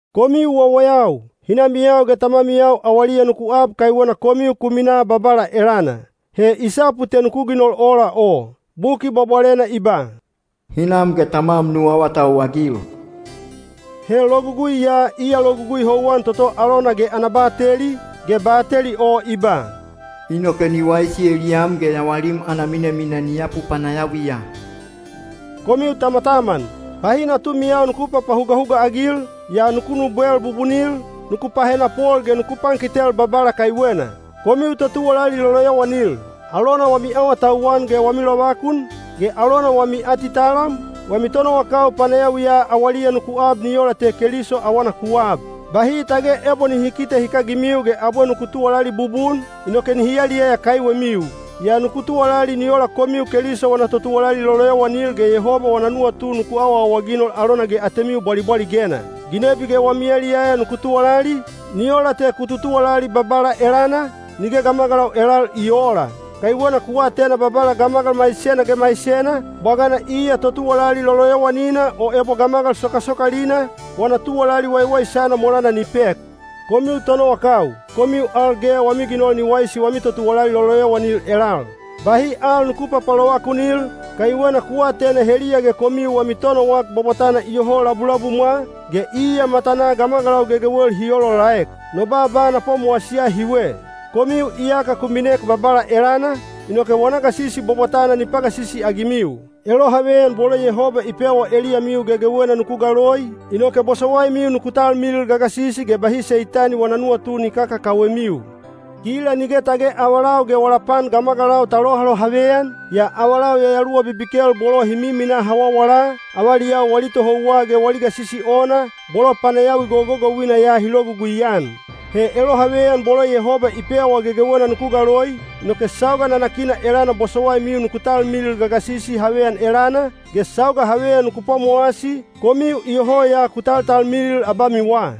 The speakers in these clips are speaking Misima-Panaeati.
Komiu wawayau, hinamiyau ge tamamiyau awaliya nuku ab kaiwena komiu ku minaa Babala elana. He i sapu te nuku ginol ola o. Buki Bwabwalena i ba, “Hinam ge tamwam nu awatauwagil.” He logugui ya iya logugui houwan toto alona ge ana bateli, ge bateli o i ba, “inoke ni waisi eliyam ge yawalim ana minamina ni yapu panayawiya.” Komiu tamataman, bahi natumiyau nuku papahugahuga-agil, yaa nuku nubwel bubunil, nuku pahenapol ge nuku pankitel Babala kaiwena. Komiu totuwalali loloyowanil, alona wami awatauwan ge wami lovakun, ge alona wami atitalam, wami tonowakau panayawiya awaliya nuku ab ni ola te Keliso awana ku aab. Bahi tage ebo nihi kite hikagimiu ge abwe nuku tuwalali bubun, inoke nihi yaliyaya kaiwemiu. Yaa nuku tuwalali ni ola komiu Keliso wana totuwalali loloyowanil ge Yehoba wana nuwatu ku awaawaginol alona ge atemiu bwalibwaligena. Ginebi ge wami yaliyaya nuku tuwalali, ni ola te ku tutuwalali Babala elana, nige gamagalau elal i oola. Kaiwena ku atena Babala gamagal maisena ge maisena, bwagana iya totuwalali loloyowanina o ebo gamagal sokasokalina, wana tuwalali waiwaisana molana ni pek. Komiu tonowakau, komiu al ge wami ginol ni waisi wami totuwalali loloyowanil elal. Bahi al nuku papalovakunil, kaiwena ku atena heliya ge komiu wami Tonowak Bwabwatana iyoho labulabumwa, ge iya matanaa gamagalau gegewel hi olaolaek. No baaba na pwamowasiya hiwe: komiu iyaka ku minek Babala elana, inoke wana gasisi bwabwatana ni pagasisi-agimiu. Elohaveyan bolo Yehoba i pewa eliyamiu gegewena nuku galoi, inoke bosowaimiu nuku talmilil gagasisi ge bahi Seitani wana nuwatu ni kakakawemiu. Kila nige tage avalau ge wala pan gamagalau ta lohalohaveyan, yaa avalau yayaluwa bibikel bolo hi miminaa hawawala, avaliyau wali tohouwa ge wali gasisi ona, bolo panayawi gogogouina ya hi logugui-an. He elohaveyan bolo Yehoba i pewa gegewena nuku galoi, inoke sauga nanakina elana bosowaimiu nuku talmilil gagasisi haveyan elana, ge sauga haveyan nuku pwamowasi, komiu iyoho ya ku taltalmilil abamiwa.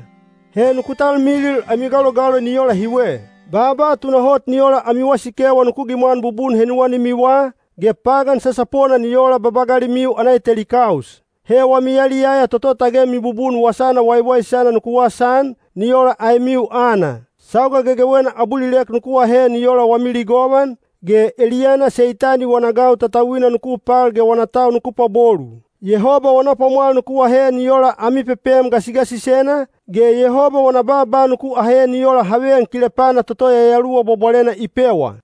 He nuku talmilil ami galogaloi ni ola hiwe. Baaba tunahot ni ola ami wasikewa nuku gimwan bubun henuwanimiwa, ge pagan sasapona ni ola babagalimiu ana eteli kaus. He wami yaliyaya toto tage mibubun Wasana Waiwaisana nuku wasaan, ni ola aemiu aana. Sauga gegewena abulilek nuku ahe ni ola wami ligovan, ge eliyana Seitani wana gau tatauina nuku pal ge wana tau nuku pwabolu. Yehoba wana pwamwal nuku ahe ni ola ami pepem gasigasisena, ge Yehoba wana baaba nuku ahe ni ola haveyan kilepana toto Yayaluwa Bwabwalena i pewa.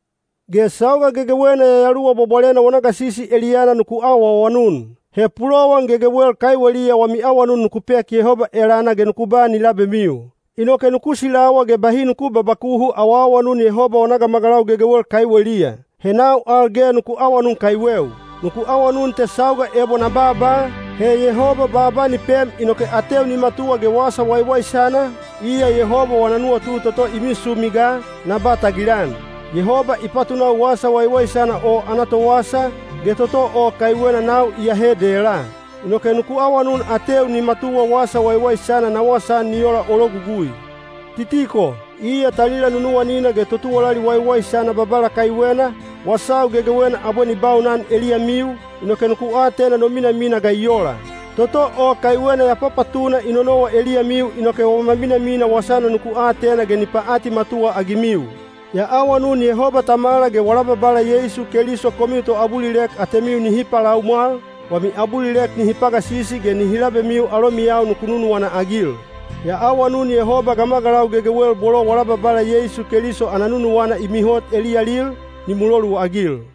Ge sauga gegewena Yayaluwa Bwabwalena wana gasisi eliyana nuku awaawanun. He pulowan gegewel kaiweliya wami awanun nuku pek Yehoba elana ge nuku ba ni labemiu. Inoke nuku silawa ge bahi nuku babakuhu awaawanun Yehoba wana gamagalau gegewel kaiweliya. He nau al ge nuku awanun kaiweu. Nuku awanun te sauga ebo na baaba, he Yehoba baaba ni pem inoke ateu ni matuwa ge Wasa Waiwaisana, iya Yehoba wana nuwatu toto i misumi ga, na ba tagilan. Yehoba i patunau Wasa Waiwaisana o ana towasa, ge toto o kaiwena nau iyahe dela. Inoke nuku awanun ateu ni matuwa Wasa Waiwaisana na wasaan ni ola o logugui. Titiko, iya talila nunuwanina ge totuwalali waiwaisana Babala kaiwena, wasau gegewena abwe ni baunan eliyamiu, inoke nuku atena no minamina ga i ola. Toto o kaiwena ya papatuna i nonowa eliyamiu inoke wama minamina wasana nuku atena ge ni paatimatuwa-agimiu. Ya awanun Yehoba Tamala ge wala Babala Yeisu Keliso komiu toabulilek atemiu nihi palaumwal, wami abulilek nihi pagasisi ge nihi labemiu alomiyau nuku nunuwana-agil. Ya awanun Yehoba gamagalau gegewel bolo wala Babala Yeisu Keliso ana nunuwana i mihot eliyalil, ni muloluagil.